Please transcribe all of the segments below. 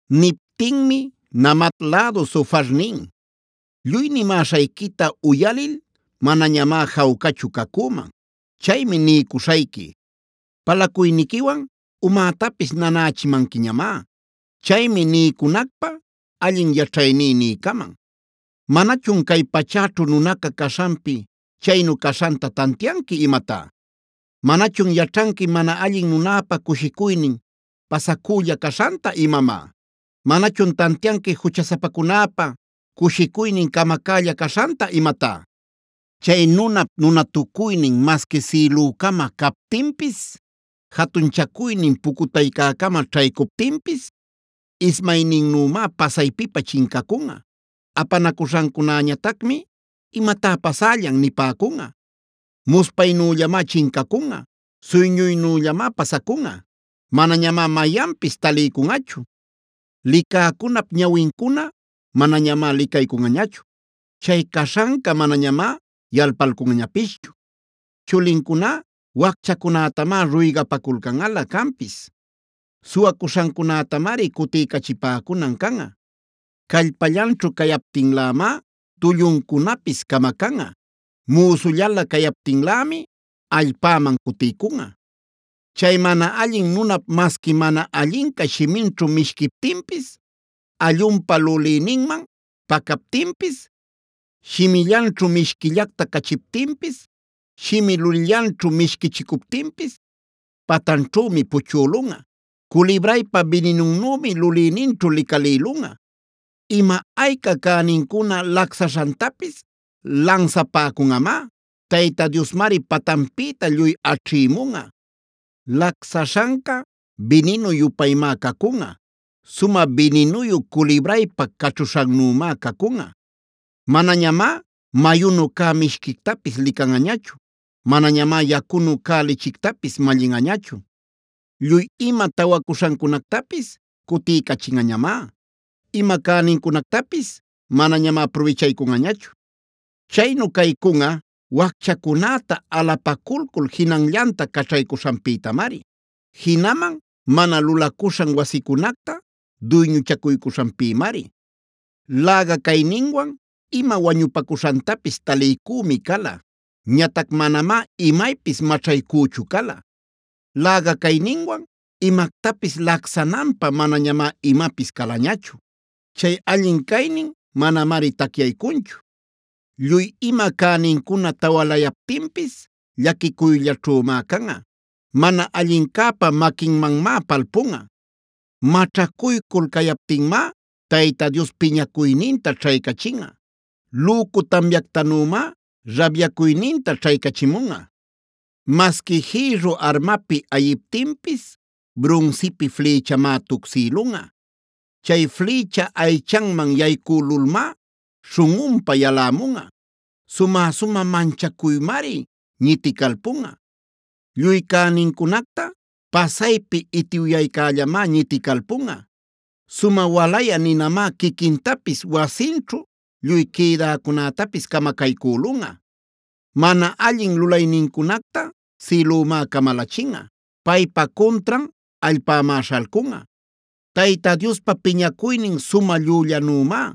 Niptinmi Naamat lädu Zofar nin: “Lluy nimäśhayquita uyalil manañamá jawcachu cacüman; chaymi niycuśhayqui. Palacuyniquiwan umätapis nanächimanquiñamá; chaymi niycunacpä allin yaćhayní niycaman. “¿Manachun cay pachäćhu nunaca caśhanpi chaynu caśhanta tantianqui imatá? ¿Manachun yaćhanqui mana allin nunäpa cushicuynin pasacülla caśhanta imamá? ¿Manachun tantianqui juchasapacunäpa cushicuynin camacälla caśhanta imatá? Chay nunap nunatucuynin masqui sïlücama captinpis, jatunchacuynin pucutaycäcama ćhaycuptinpis, ismayninnümá pasaypipä chincacunꞌa. Apanacuśhancunäñatacmi: ‘¿Imatá pasällan?’ Muspaynüllamá chincacunꞌa; suyñuynüllamá pasacunꞌa. Manañamá mayanpis taliycunꞌachu. Licäcunap ñawincuna manañamá licaycunꞌañachu; chay caśhanca manañamá yalpalcunꞌañapischu. Chulincuná wacchacunätamá ruygapaculcanꞌalä canpis; suwacuśhancunätamari cutiycachipäcunan canꞌa. Callpallanćhu cayaptinlämá tulluncunapis camacanꞌa; müsullalä cayaptinlämi allpäman cutiycunꞌa. “Chay mana allin nunap masqui mana allinca shiminćhu mishquiptinpis, allunpa lulïninman pacaptinpis, shimillanćhu mishquillacta cachiptinpis, shimi-lulïllanćhu mishquichicuptinpis, patanćhümi puchꞌülunꞌa; culibraypa bininunnümi lulïninćhu licalïlunꞌa. Ima ayca cänincuna lacsaśhantapis lansapacämunꞌamá; Tayta Diosmari patanpïta lluy aćhïmunꞌa. Lacsaśhanca bininu-yupaymá cacunꞌa; sumä bininuyu culibraypa caćhuśhannümá cacunꞌa. Manañamá mayunu cä mishquictapis licanꞌañachu. Manañamá yacunu cä lichictapis mallinꞌañachu. Lluy ima tawacuśhancunactapis cutiycachinꞌañamá; ima cänincunactapis manañamá prubichaycunꞌañachu. Chaynu caycunꞌa wacchacunäta alapaculcul jinanllanta caćhaycuśhanpïtamari. Jinaman mana lulacuśhan wasicunacta duyñuchacuycuśhanpïmari. Läga-cayninwan ima wañupacuśhantapis taliycümi cala; ñatac manamá imaypis maćhaycüchu cala. Läga-cayninwan imactapis lacsananpä manañamá imapis calañachu; chay allin caynin manamari tacyaycunchu. Lluy ima cänincuna tawalayaptinpis llaquicuyllaćhümá canꞌa; mana allincäpa maquinmanmá palpunꞌa. “Maćhacuycul cayaptinmá, Tayta Dios piñacuyninta ćhaycachinꞌa; lücu tamyactanümá rabyacuyninta ćhaycachimunꞌa. Masqui jïrru armapi ayiptinpis brunsipi flïchamá tucsïlunꞌa. Chay flïcha aychanman yaycülulmá śhunꞌunpa yalämunꞌa. Sumä-sumä manchacuymari niticalpunꞌa. Lluy cänincunacta pasaypi itiwyaycällamá ñiticalpunꞌa; sumä walayä ninamá quiquintapis wasinćhu lluy quïdäcunätapis camacaycülunꞌa. Mana allin lulaynincunacta sïlümá camalachinꞌa; paypa cuntran allpämá śhalcunꞌa. Tayta Diospa piñacuynin sumä llüllanümá,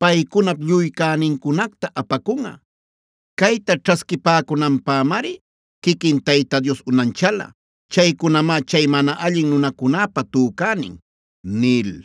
paycunap lluy cänincunacta apacunꞌa. Cayta ćhasquipäcunanpämari quiquin Tayta Dios unanchala; chaycunamá chay mana allin nunacunäpa tücänin” nil.